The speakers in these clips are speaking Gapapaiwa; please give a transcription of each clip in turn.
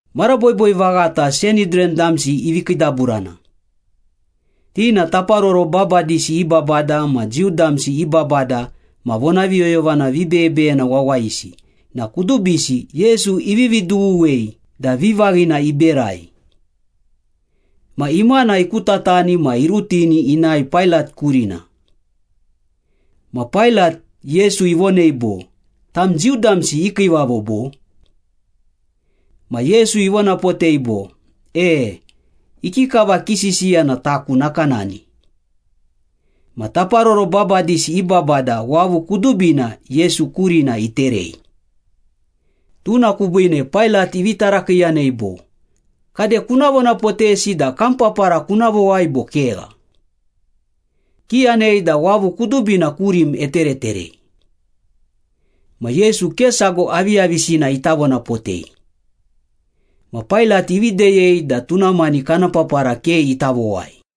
Mara boiboi vaghata Sanhidran damsi ivi kiidaburana. Ti na taparoro babadisi i babada ma Jiu damsi i babada ma vonaviyoyovana vibeyebeyena wawayisi na kudubisi Yesu ivivi dughuwei da vivaghina iberai. Ma imana ikutatani ma irutini inae Pailat kurina. Ma Pailat, Yesu ivonei bo, “Tam Jiu damsi i kiivavo bo?” Ma Yesu ivonapotei bo, “E, ikikava kisisiya na taku nakanani.” Ma taparoro babadisi i babada wavu kudubina Yesu kurina iterei. Tuna kubiine Pailat ivi tarakiiyanei bo, “Kade, kuna vonapotesi da kam papara kuna vowai bo kegha? Kiyanei da wavu kudubina kurim etereterei.” Ma Yesu ke sago aviyavisina ita vonapotei. Ma Pailat ivi deyei da tuna mani kana papara ke ita vowai.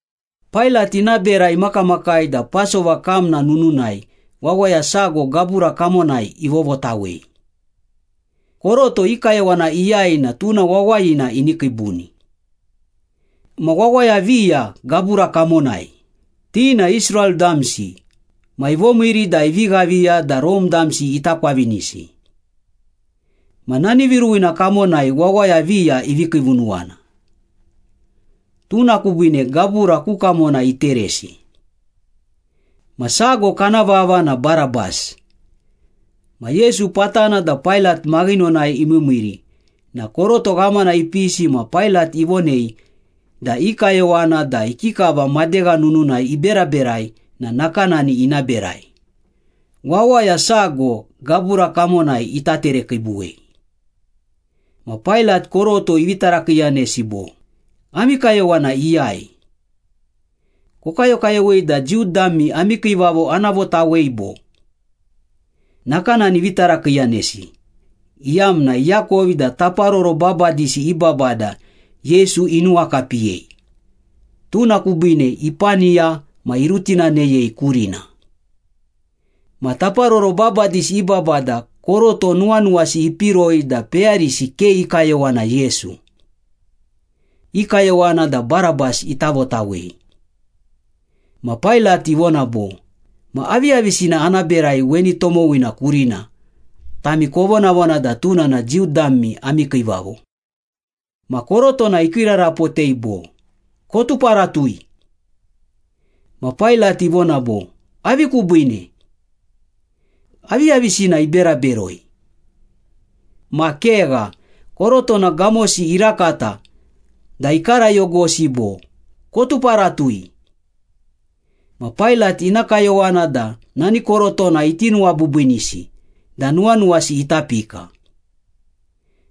Pailat ina bera imakamakai da Pasova kamna nununai wawaya sago gabura kamonai ivovotawei. Koroto i kayowana iyai na tuna wawayina ini kiibuni. Ma wawaya viya gabura kamonai, ti na Israel damsi ma ivomiiri da ivi ghaviya da Rome damsi ita kwavinisi. Ma nani viruwina kamonai wawaya viya ivi kiivunuwana. Tuna kubiine gabura ku kamona iteresi. Ma sago kana vava na Barabas. Ma Yesu patana da Pailat maghinonai imiimiiri na koroto ghamana ipisi ma Pailat ivonei da i kayowana da ikikava madegha nununai iberaberai na nakanani ina berai, wawaya sago gabura kamonai ita terekiibuwei. Ma Pailat koroto ivi tarakiiyanesi bo, “Ami kayowana iyai? Kokayokayowei da Jiu dami ami kiivavo ana votawei, bo?” Nakanani ivi tarakiiyanesi iyamna iakovi da taparoro babadisi i babada Yesu inuwakapiyei, tuna kubiine ipaniya ma irutinaneyei kurina. Ma taparoro babadisi i babada koroto nuwanuwasi ipiroi da peyarisi ke i kayowana Yesu. I kayowana da Barabas ita votawei. Ma Pailat ivona bo, “Ma aviyavisina ana berai weni tomowina kurina, tami kovonavona da tuna na Jiu dami ami kiivavo?” Ma korotona ikiirarapotei bo, “Kotuparatui.” Ma Pailat ivona bo, “Avi kubiine? Aviyavisina ibera beroi?” Ma kegha, korotona gamosi irakata da ikarayogosi bo, “Kotuparatui!” Ma Pailat ina kayowana da nani korotona iti nuwabiibiinisi da nuwanuwasi ita pika.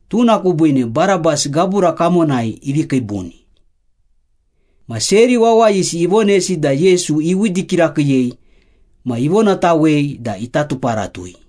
Tuna kubiine Barabas gabura kamonai ivi kiibuni. Ma seri wawayisi ivonesi da Yesu iwidi kirakiiyei ma ivonatawei da ita tuparatui.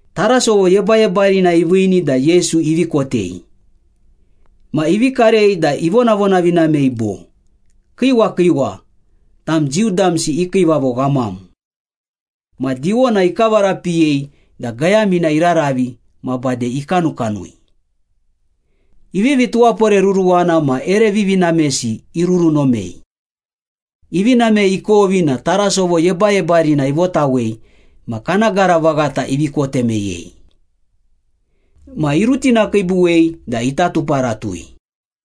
Tarasovo yebayebarina iviini da Yesu ivi kotei. Ma ivi karei da ivonavonavinamei bo, “Kiiwa kiiwa! Tam Jiu damsi i kiivavo ghamam!” Ma diwona ikavarapiyei da gayamina iraravi ma bade ikanukanui. Ivivi tuwaporeruruwana ma ere vivinamesi irurunomei. Ivi namei ikovi na tarasovo yebayebarina ivotawei ma kana gara vaghata ivi kote meyei. Ma irutinakiibuwei da ita tuparatui.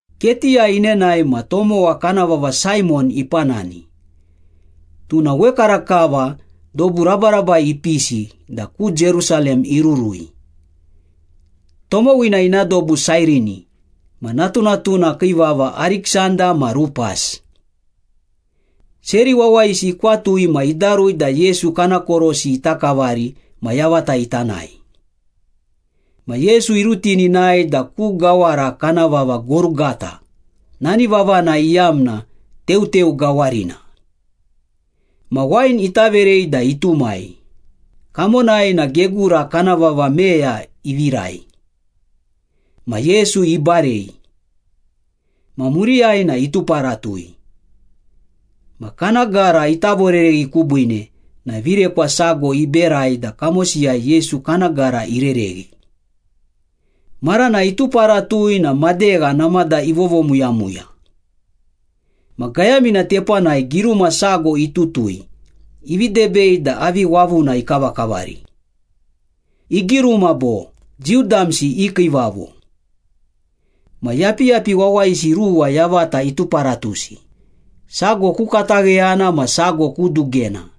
Ketiyai inenae ma tomowa kana vava Saimon ipanani, tuna wekarakava dobu rabarabai ipisi da ku Jerusalem irurui. Tomowina ina dobu Sairini ma natunatuna kii vava Ariksanda ma Rupas. Seri wawayisi ikwatui ma idarui da Yesu kana korosi ita kavari ma yavata ita nae. Ma Yesu irutini inae da ku gawara kana vava Gorugata, nani vavana iyamna ‘Teuteu Gawarina.’ Ma wain ita verei da itumai, kamonai na gegura kana vava meya ivirai. Ma Yesu ibarei. Ma muriyai na ituparatui. Ma kana gara ita vorereghi kubiine na virekwa sago iberai da kamosiyai Yesu kana gara irereghi. Marana ituparatui na madegha namada ivovomuyamuya. Ma gayamina tepanai giruma sago itutui ivi debei da avi wavuna ikavakavari. Igiruma bo, “Jiu damsi i kiivavo.” Ma yapiyapi wawayisi ruwa yavata ituparatusi, sago ku katagheyana ma sago ku dugena.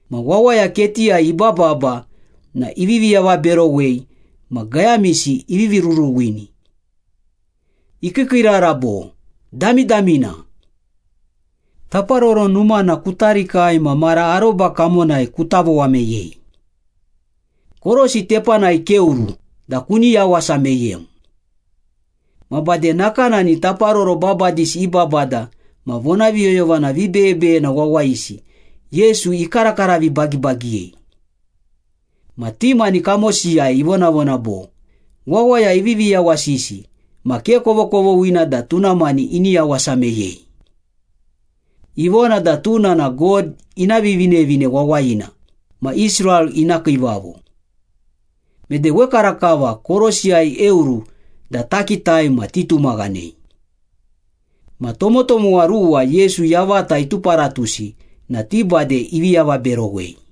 Ma wawaya ketiyai ibababa na ivivi avaberowei ma gayamisi ivivi ruruwini. Ikiikiirara bo, “Damidamina! Taparoro Numana kuta rikai ma mara aroba kamonai kuta vowa meyei. Korosi tepanai keoru da kuni yawasa meyem!” Ma bade nakanani taparoro babadisi i babada ma vonaviyoyovana vibeyebeyena wawayisi Yesu ikarakara vibagibagiyei. Ma ti mani kamosiyai ivonavona bo, “Wawaya ivivi yawasisi ma ke kovokovoghina da tuna mani ini yawasa meyei. Ivona da tuna na God ina Vivinevine Wawayina ma Israel ina kiivavo. Mede wekarakava korosiyai eoru da takitai ma titumaghanei.” Ma tomotomowa ruwa Yesu yavata ituparatusi na ti bade ivi avaberowei.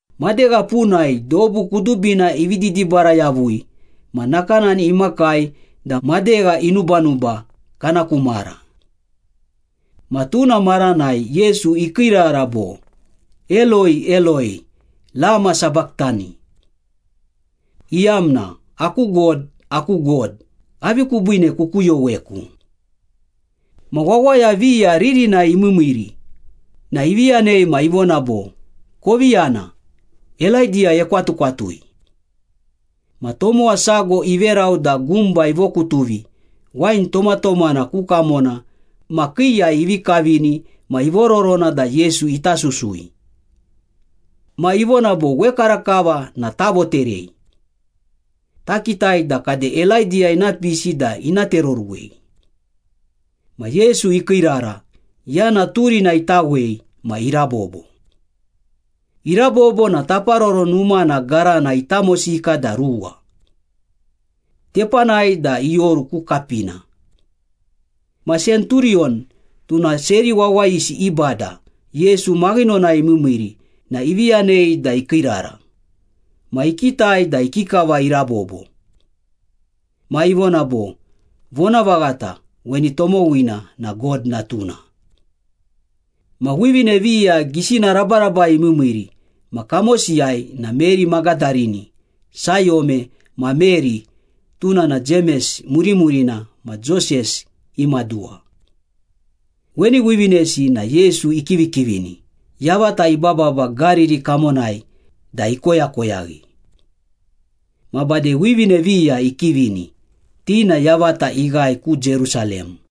Madegha punai dobu kudubina ivi didibara yavui ma nakanani imakai da madegha inubanuba kana ku mara. Ma tuna maranai Yesu ikiirara bo, “Eloi, Eloi, lama sabachthani?” iyamna, “Aku God, aku God, avi kubiine kukuyoweku?” Ma wawaya viya ririnai imiimiiri na ivi yanei ma ivona bo, “Kovi yana, Elaidiya ekwatukwatui.” Ma tomowa sago iverau da gumba ivokutuvi wain tomatomana ku kamona ma kiiyai ivi kavini ma ivororona da Yesu ita susui. Ma ivona bo, “Wekarakava na tavoterei. Takitai da kade Elaidiya ina pisi da ina tereoruwei.” Ma Yesu ikiirara, yana turina itawei ma irabobo. Irabobo na Taparoro Numana garana itamosika da ruwa. Tepanai da ioru ku kapina. Ma senturiyon, tuna seri wawayisi i bada Yesu maghinonai imiimiiri na ivi yanei da ikiirara, ma ikitai da ikikava irabobo. Ma ivona bo, “Vonavaghata, weni tomowina na God Natuna.” Ma wivine viya gisina rabarabai imiimiiri ma kamosiyai na Meri Magadarini, Sayome ma Meri (tuna na Jemes murimurina ma Joses i maduwa). Weni wivinesi na Yesu ikivikivini, yavata ibababa Gariri kamonai da ikoyakoyaghi. Ma bade wivine viya ikivini, ti na yavata ighae ku Jerusalem.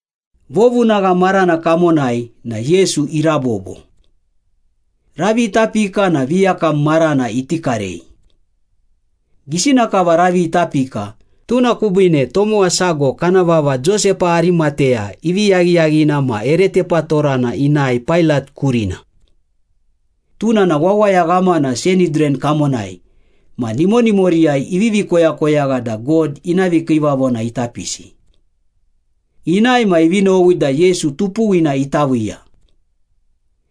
Vovunagha marana kamonai na Yesu irabobo. Ravi ita pika na viyakam marana iti karei. Gisina kava ravi ita pika, tuna kubiine tomowa sago kana vava Josepa Arimateya ivi yaghiyaghina ma ere tepatorana inae Pailat kurina. Tuna na wawaya ghamana Sanhidran kamonai ma nimonimoriyai ivivi koyakoyagha da God ina vikiivavona ita pisi. Inae ma ivi nowi da Yesu tupuwina ita viiya.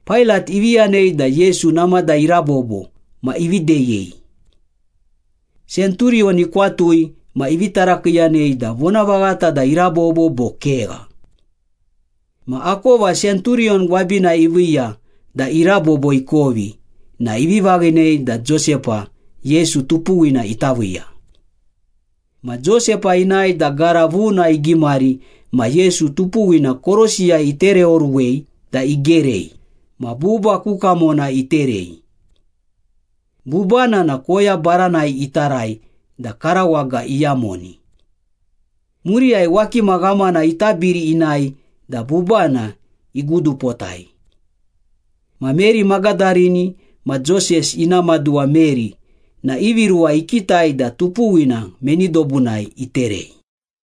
Pailat ivi yanei da Yesu namada irabobo ma ivi deyei. Senturiyon ikwatui ma ivi tarakiiyanei da vonavaghata da irabobo bo kegha. Ma akova senturiyon gwabinai iviiya da irabobo ikovi na ivi vaghinei da Josepa, Yesu tupuwina ita viiya. Ma Josepa inae da gara vuna igimari ma Yesu tupuwina korosiyai itereoruwei da igerei, ma buba ku kamona iterei. Bubana na koya baranai itarai da karawaga iyamoni. Muriyai wakima ghamana itabiri inae da bubana igudupotai. Ma Meri Magadarini ma Joses ina maduwa Meri na ivi ruwa ikitai da tupuwina meni dobunai iterei.